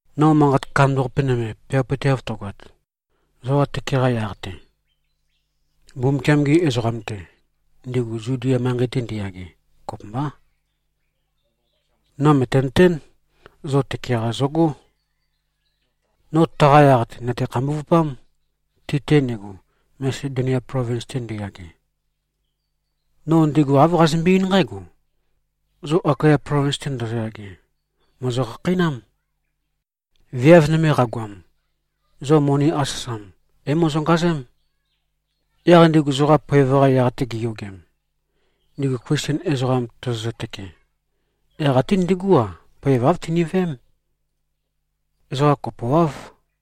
No manqat kandambaqape nøme peawapøteav tøgoat, zoqa tøke-qa yaq-te, Mbumbukiam-gi ezoqam-te, ndigu Zudia manqei-te ndiyage, kopømbá. No mø̀tenøtén, zo tøke-qa zogó. No taqa yaq-te, nø̀te-khambuvupám, ti-te ndigu, Masedonia plovins-te ndiyage. No ndigu āv qazømbe-eín nqǽgo: Zo Akaya plovins-te ndozoyage, mòzo-khakheinám. Viav nøme qagoam, zo moni asøsam é-mozongazém. Yaq ndigu zoqa poev-qa yaq-te giyogem, ndigu Klisten ezoqam tozozø-tøke, yaq ate ndigú-a, poev āv tiniveém. Ezoqa kopoáv.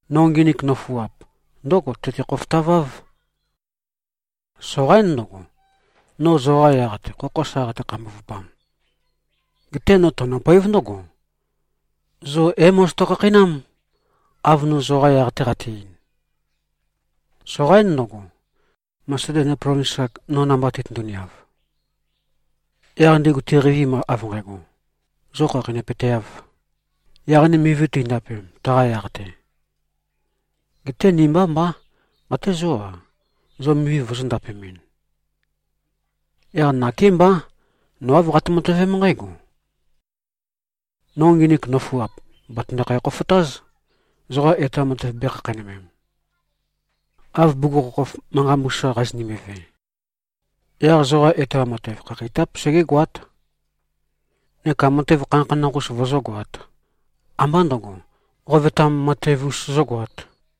No nginik nøfuap ndǿgo tøte-khofotaváv: Soqaín ndøgo, no zoqa yaq-te khokho sa qate-khambuvupam. Geté no tønøpoév ndǿgo: Zo é-mozoto-khakheinám, av no zoqa yaq-te qate-ein. Soqaín ndøgo, Masedonia plovins-ak no namba titøndu-niav, yaq ndigu tiqeivim av nqægo, zo khakheinøpøteāv, yaq ni mivi teindapem, taqa yaq-te. Geté ni mbá mbá. Até zó-a, zo mivi vozō-ndapemɨn. Yaq nakémbá, no āv qate-matøvém nqǽgo: No nginik nøfuap, bàtøndokhæ-khofotáz, zoqa etoam matev bēkhakheinømem, av bugukhokhof manqa mbusa qazønimbi-ve. Yaq zoqa etoam matev, khakheitáp segégoát, neka matev khanakhanakh-us vozógoāt, ambá ndø̄go, qovetam matev-us zógoāt.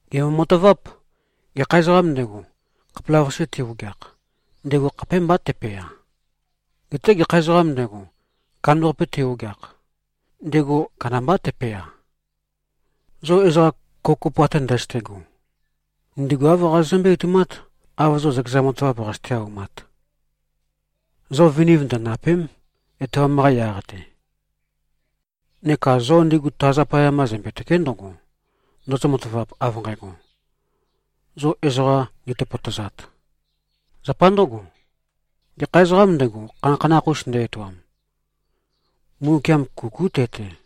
Gèmbo-mataváp: Gekha ezoqām ndego, khapelavøqase te-ogeakh, ndego khapémbá tepea. Geté gekha ezoqām ndego, kandambaqape te-ogeakh, ndego kandambá tepea. Zo ezoqa kopokopo ate ndøzøte꞉go, ndigu āv qazozømbé-etoumát, av zo zøkezan matavap qazøte-aumat. Zo viniv ndøndàpe᷄m, etoam-qa yaq-te. Neka zo ndigu ta zapaya mba zømbe-tø̀ke᷄ ndøgo, ndozo-matavap av nqægo, zo ezoqa nditøpøtøzat. Zapa ndǿgo, gekha ezoqām ndego, khanakhanakh-us nde-etoam, Mbumbukiam kukú te-te.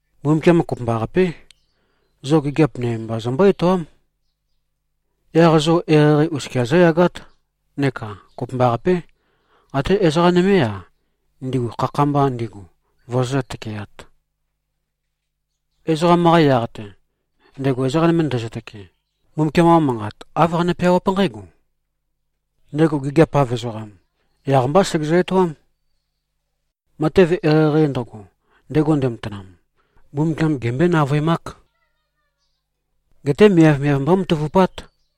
Mbumbukiam kopømbaqapé, zo gigiap nøme mba zømbó-etoám. Yaq zo eqeieqei oskia zóyagát, neka kopømbaqapé, até ezoqa nømé-a, ndigu khakha-mba ndigu, vozozǿ-tøkeāt. Ezoqam-qa yaq-te, ndego ezoqa nøme ndezø-tøkee, Mbumbukiam-qa manqat, āv qane-peawáp nqǽgo, “Ndego gigiap-av ezoqam, yaq-mbá segezø-etoám. Matev eqeieqei ndøgo, ndego ndematanam, Mbumbukiam gembøé-navøemák. Geté miavmiav mbómatavupát.”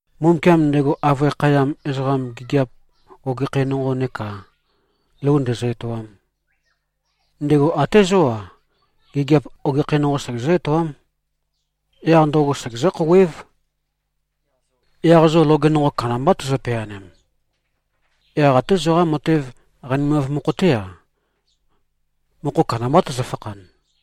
Mbumbukiam, ndego avøe khayam ezoqam gigiap ogekhæ nonqo neka lou ndezø-etoam, ndego até zó-a, gigiap ogekhæ nonqo segezǿ-etoám. Yaq ndøgo segezǿ-khouwév. Yaq zo loge nonqo kandambá tozo-peanem. Yaq até zoqa matev qanimav mokho-té-a, mokho kandambá tøzøfakhan.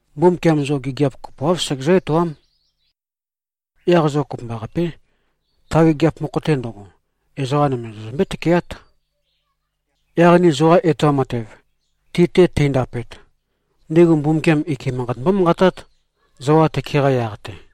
Mbumbukiam zo gigiap kopoáv segezǿ-etoám. Yaq zo kopømbaqapé, ta gigiap mokho-te ndøgo, ezoqa nøme zozømbé-tøkeát. Yaq ni zoqa etoam matev, ti-te teindapet, ndigu Mbumbukiam ike manqat mbómanqatát, zoqa tøke-qa yaq-te.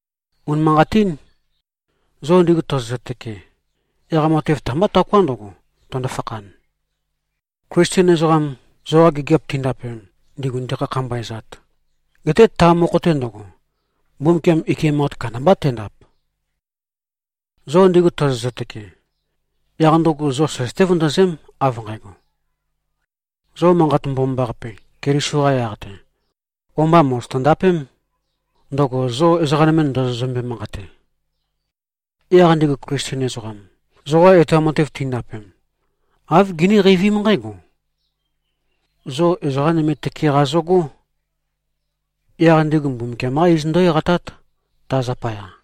Unimanqatín. Zo ndigu tozozø-tøke, yaq matev ta-mbá taoká ndøgo, tøndo-fakhan, Klisten ezoqam zoqa gigiap tindapem, ndigu ndikhakhambaezat. Geté ta mokho-te ndøgo, Mbumbukiam ike manqat kandambá tendap. Zo ndigu tozozø-tøke, yaq ndøgo zo søzøté-vøndøzém, av nqægo: Zo Manqat Mbomambaqape, Keliso-qa yaq-te, o-mba mòzoto-ndapém, ndøgo zo ezoqa nøme ndozozømbe-manqate. Yaq ndigu Klisten ezoqam, zoqa etoam matev tindapem, āv giní-qeivím nqǽgo: Zo ezoqa nøme tøke-qa zøgó. Yaq ndigu Mbumbukiam-qá iz ndǿ-eqatát, ta zapaya.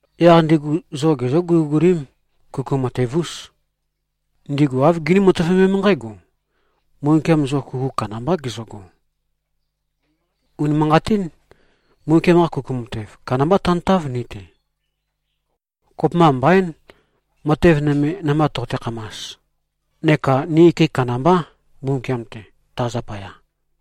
Yaq ndigu zo gezǿ-guligulím. Kuku matev-ús. Ndigu āv giní-matøvemém nqǽgo: Mbumbukiam zo kuku kandambá gezøgo. Unimanqatín. Mbumbukiam-qa kuku matev kandamba tantáv, ni-te. Kopømba mbaín, matev nøme namba toqote-khamas. Neka ni ike kandambá, Mbumbukiam-te, ta zapaya.